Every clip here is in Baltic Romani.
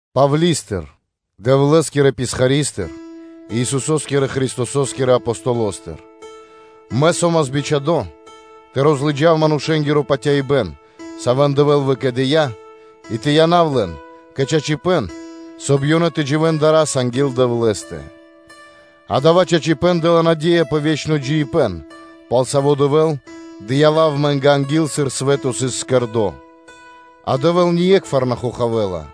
Павли́стыр, Дэвлэ́скирэ писхаристыр и Исусо́скирэ Христосо́скирэ Апостолостыр. Мэ со́мас бичхадо́ тэ розлыджав манушэ́нгиро патяибэ́н, савэ́н Дэвэ́л выкэдыя́, и тэ янав лэн кэ чачипэ́н, соб (кай) ёнэ тэ дживэ́н дара́са анги́л Дэвлэ́стэ; дава́ чачипэ́н дэ́ла наде́я пэ ве́чно джиибэ́н, пал саво́ Дэвэ́л дыя́ лав амэ́нгэ анги́л, сыр свэ́то сыс создыно́, а Дэвэ́л ние́кхвар на хохавэла,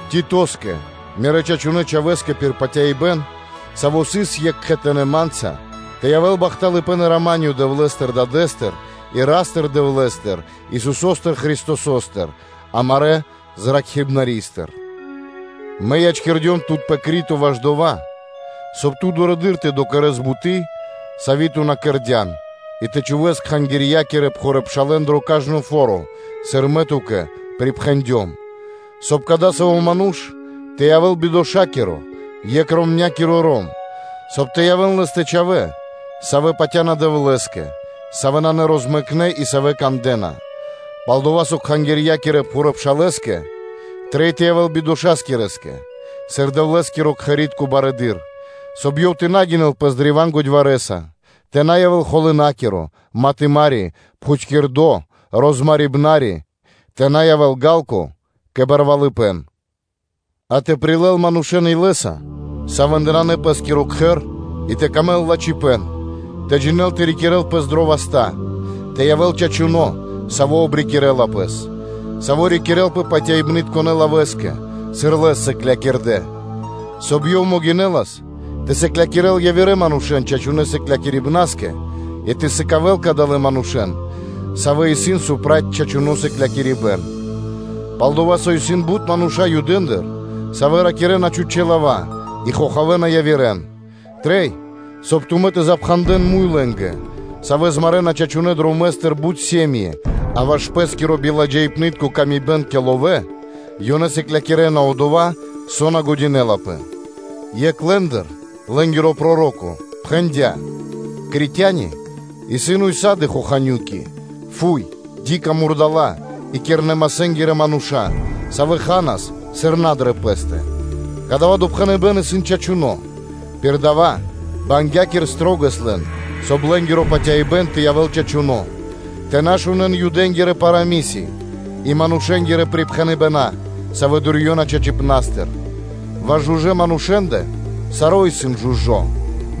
Титоскэ, мирэ́ чачунэ́ чхавэ́скэ пир патяибэ́н, саво́ сыс екх кхэтанэ́ ма́нца, тэ явэ́л бахталыпэ́н ла́ска и рама́нё Дэвлэ́стыр – Дадэ́стыр и Ра́стыр-Дэвлэ́стыр, Исусо́стыр Христосостыр амарэ́ Зракхибнаристыр. Мэ ячкирдём тут пэ Крито ваш дова́, соб (кай) ту дурэды́р тэ докэрэс буты́, сави́ ту на кэрдя́н кэ ко́нцо (кэ ягор) и тэ чхувэ́с пхурэды́р пшалэ́н дро кажно фо́ро, сыр мэ ту́кэ припхэндём: соб (кай) кадасаво́ ману́ш тэ явэ́л бидошакиро, екхэ-ромнякиро ром, соб (кай) тэ явэ́н лэ́стэ чхавэ́, савэ́ патя́на Дэвлэ́скэ, савэ́ исын нарозмэкнэ, и савэ́ кандэ́на. Пал-дова́ со пхурыдырэ́ пшалэ́скэ трэй тэ явэ́л бидошакирэскэ, сыр Дэвлэ́скирэ-кхэритконэ́ барыдырэ́скэ, соб (кай) ёв тэ на гинэл пэс древа́н годьварэса, тэ на явэ́л холынакиро, матымари, пхутькирдо, розмарибнари, тэ на явэ́л ёв ґа́лко кэ барвалыпэ́н; а тэ прилэл манушэ́н илэ́са, савэ́ндэ нанэ пэ́скиро кхэр и тэ явэ́л дро́го лэ́скэ лачхипэ́н, тэ джинэ́л тэ рикирэ́л пэс дрэ васта́, тэ явэ́л ёв чачуно́, саво́ обрикирэла пэс, саво́ рикирэлпэ патяибнытконэ лавэ́скэ, сыр лэс сыклякирдэ́, соб (кай) ёв могинэлас тэ сыклякирэ́л явирэ манушэ́н чачунэ́ сыклякирибнаскэ, и тэ сыкавэ́л кадалэ́ манушэ́н, савэ́ исын проти чачуно́ сыклякирибэ́н. Пал-дова́ со исын бут мануша́ Юдэндыр, савэ́ ракирэ́на чхучэ́ лава́ и хохавэна явирэ́н, трэй, соб (кай) тумэ́ тэ запхандэн муй лэ́нгэ, савэ́ змарэна чачунэ́ дромэ́стыр бут сэм΄и (ирья́), а ваш пэ́скиро биладжаипнытко тырдыпэ́н кэ ловэ́ ёнэ сыклякирэ́на одова́, со на трэй. Екх лэ́ндыр лэ́нгиро проро́ко пхэндя́: “Критяни исын ўса́ды (сак) хоханю́ки, фуй, бу́са (дика) мурдала́ и кирнэ-масэнгирэ мануша́, савэ́ ханас, сыр на дрэ пэ́стэ.” Кадава́ допхэныбэ́н исын чачуно́; пир дава́ бангякир шылалэс лэн, соб (кай) лэ́нгиро патяибэ́н тэ явэ́л чачуно́, тэ на шунэ́н Юдэ́нгирэ парамыси́ (сказки) и манушэ́нгирэ припхэныбэна́, савэ́ дурьёна чачипнастыр. Ваш жужэ́ манушэ́нгэ – саро́ исын жужо́,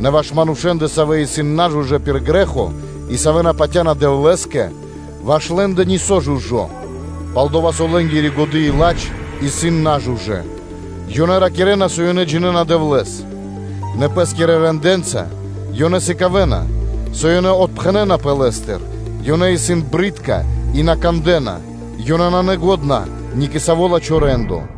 нэ ваш манушэ́нгэ, савэ́ исын нажужэ́ пир грэ́хо, и савэ́ на патя́на Дэвлэ́скэ, ваш лэ́нгэ нисо́ нанэ жужо́, пал-дова́ со лэ́нгири годы́ и ладж исын нажужэ́. Ёнэ ракирэ́на, со ёнэ джинэ́на Дэвлэ́с, нэ пэ́скирэ рэндэ́нца ёнэ сыкавэ́на, со ёнэ отпхэнэнапэ Лэ́стыр, ёнэ исын джунгалэ́ и на кандэ́на, ёнэ нанэ лачхэ́ ни кэ саво́ лачхэ́ рэ́ндо.